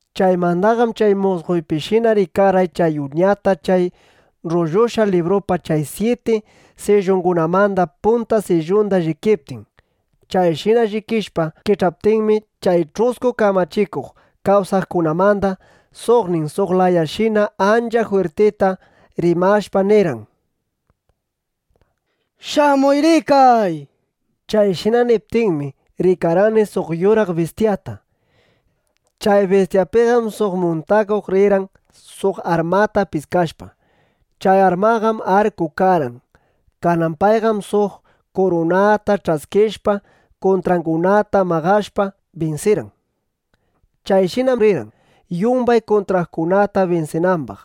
Chaymandaqam chay musqoypishina rikarqay chay Uñata chay rrullushqa librupa chay syiti sillungunamanda punta sillunda llikiptin. Chayshina llikishpa kich'aptinmi, chay ch'usku kamachikuq kawsaqkunamanda suqnin suq lanyaqshina ancha jwirtita rimashpa nirqan: —¡Shamuy ˻rikay˼! nishpa. Chayshina niptinmi, rikarqani suq yuraq bistyata. Chay bistyapim suq muntakuq rirqan suq armata piskashpa. Chay armanqam arku karqan. Kanan payqam suq kurunata ch'askishpa, kuntrangunata maqashpa, binsirqan. Chayshinam rirqan, yumbay kuntrangunata binsinambaq.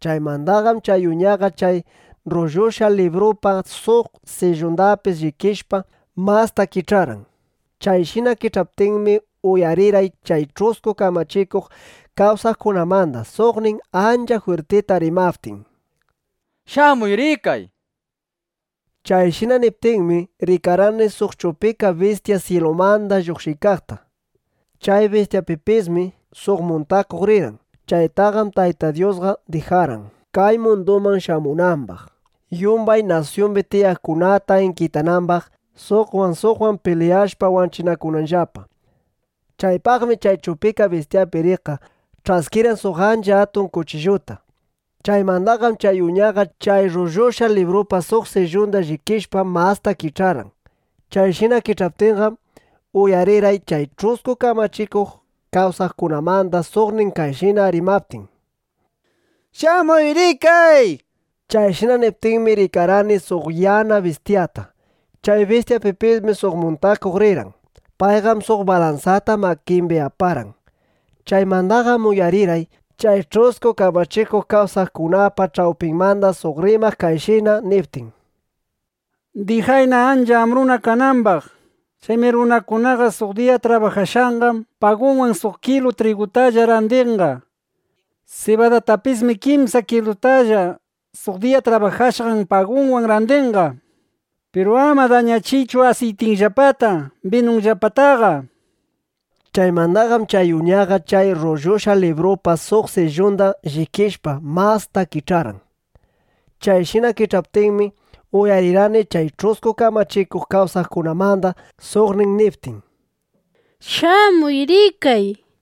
Chaymandaqam chay Uñaqa chay rrullushqa librupa suq sillundapis llikishpa, masta kich'arqan. Chayshina kich'aptinmi, uyarirqay chay ch'usku kamachikuq kawsaqkunamanda suqnin ancha jwirtita rimaptin: —¡Shamuy ˻rikay˼! nishpa. Chayshina niptinmi, rikarqani suq chupika bistya syilumanda lluqshiykaqta. Chay bistyapipismi suq muntakuq rirqan. Chaytaqam Tayta Dyusqa dijarqan, kay munduman shamunambaq, yumbay nasyumbi tiyaqkunata inkitanambaq, suqwan suqwan pilyashpa wanchinakunanllapa. Chaypaqmi chay chupika bistyapi riqqa ch'askirqan suq ancha atun kuchilluta. Chaymandaqam chay Uñaqa chay rrullushqa librupa suq sillunda llikishpa, masta kich'arqan. Chayshina kich'aptinqam, uyarirqay chay ch'usku kamachikuq kawsaqkunamanda suqnin kayshina rimaptin: —¡Shamuy ˻rikay˼! nishpa. Chayshina niptinmi, rikarqani suq yana bistyata. Chay bistyapipismi suq muntakuq rirqan. Payqam suq balansata makimbi aparqan. Chaymandaqam uyarirqay chay ch'usku kamachikuq kawsaqkunapa ch'awpinmanda suq rimaq kayshina niptin: —Dijayna ancha ambruna kanambaq. Chaymi runakunaqa suq diya trabajashqan pagunwan suq kilu trigutalla randinqa. Sibadatapismi kimsa kilustalla suq diya trabajashqan pagunwan randinqa. Piru ama dañachiychu asiytinllapata, binunllapataqa, nishpa. Chaymandaqam chay Uñaqa chay rrullushqa librupa suq sillunda llikishpa, masta kich'arqan. Chayshina kich'aptinmi, uyarirqani chay ch'usku kamachikuq kawsaqkunamanda suqnin niptin: —¡Shamuy ˻rikay˼! nishpa.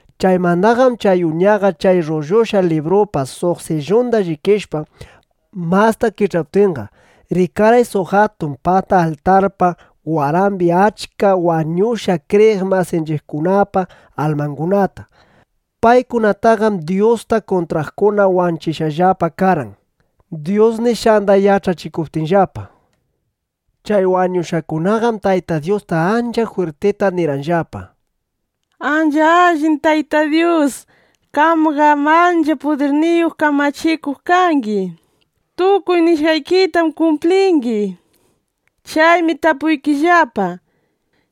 Chaymandaqam chay Uñaqa chay rrullushqa librupa suq sillunda llikishpa, masta kich'aptinqa, rikarqay suq atun pata altarpa warambi achka wañushqa kriyiq masinchiqkunapa almangunata. Paykunataqam Dyusta kuntraqkuna wanchishqallapa karqan, Dyus nishqanda yach'achikuptinllapa. Chay wañushqakunaqam Tayta Dyusta ancha jwirtita nirqanllapa: —Ancha allin Tayta Dyus, qamqam ancha pudirniyuq kamachikuq kangi. Tukuy nishqaykitam kumplingi. Chaymi tapuykillapa: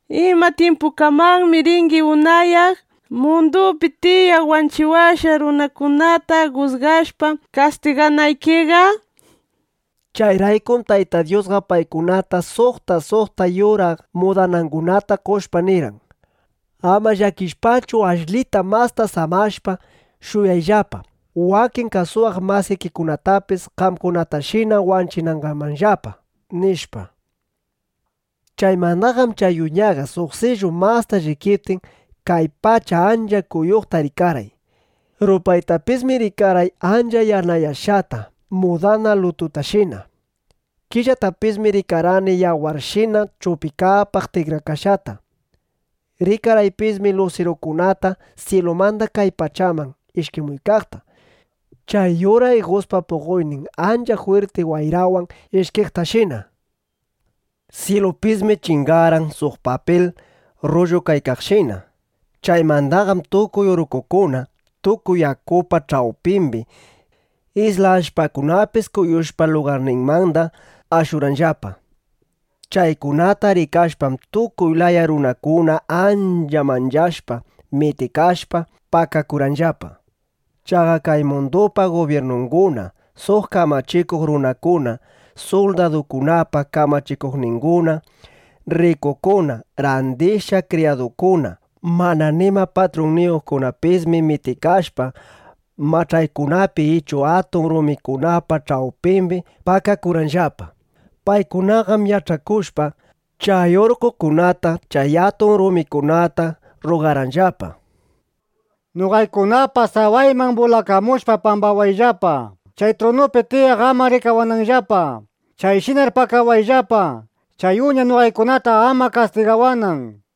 ¿Ima tyimpukamanmi ringi unayaq, mundupi tiyaq wanchiwashqan runakunata jusgashpa, kastiganaykiqa? nishpa. Chayraykum Tayta Dyusqa paykunata suqta suqta yuraq mudanakunata qoshpa, nirqan: —Ama llakishpachu, ashlita masta samashpa shuyayllapa, wakin kasuwaq masikikunatapis qamkunatashina wanchinangamanllapa, nishpa. Chaymandaqam chay Uñaqa suq sillu masta llikiptin, kay pacha ancha kuyuqta rikarqay. Rupaytapismi rikarqay ancha yanayashqata mudana lututashina. Killatapismi rikarqani yawarshina chupikapaq tikrakashqata. Rikarqaypismi lusirukunata syilumanda kay pachaman ishkimuykaqta, chay yura iguspa puqoynin ancha jwirti wayrawan ishkiqtashina. Syilupismi chingarqan suq papil rrullukaykaqshina. Chaymandaqam tukuy urqqokuna, tukuy yakupa ch'awpimbi isla allpakunapis kuyushpa lugarninmanda ashurqanllapa. Chaykunata rikashpam, tukuy laya runakuna ancha manchashpa, mitikashpa, pakakurqanllapa. Chaqa kay mundupa gubyirnunguna, suq kamachikuq runakuna, suldadukunapa kamachikuqninguna, rrikukuna, randishqa kriyadukuna, mana nima patrunniyuqkunapismi mitikashpa, mach'aykunapi ichu atun rumikunapa ch'awpimbi pakakurqanllapa. Paykunaqam qayach'akushpa, chay urqqokunata, chay atun rumikunata rrugarqanllapa: —¡Noqaykunapa sawayman bulakamushpa pakawayllapa, chay trunupi tiyaq ama rikawananllapa! Chayshinar pakawayllapa, chay Uña noqaykunata ama kastigawanan.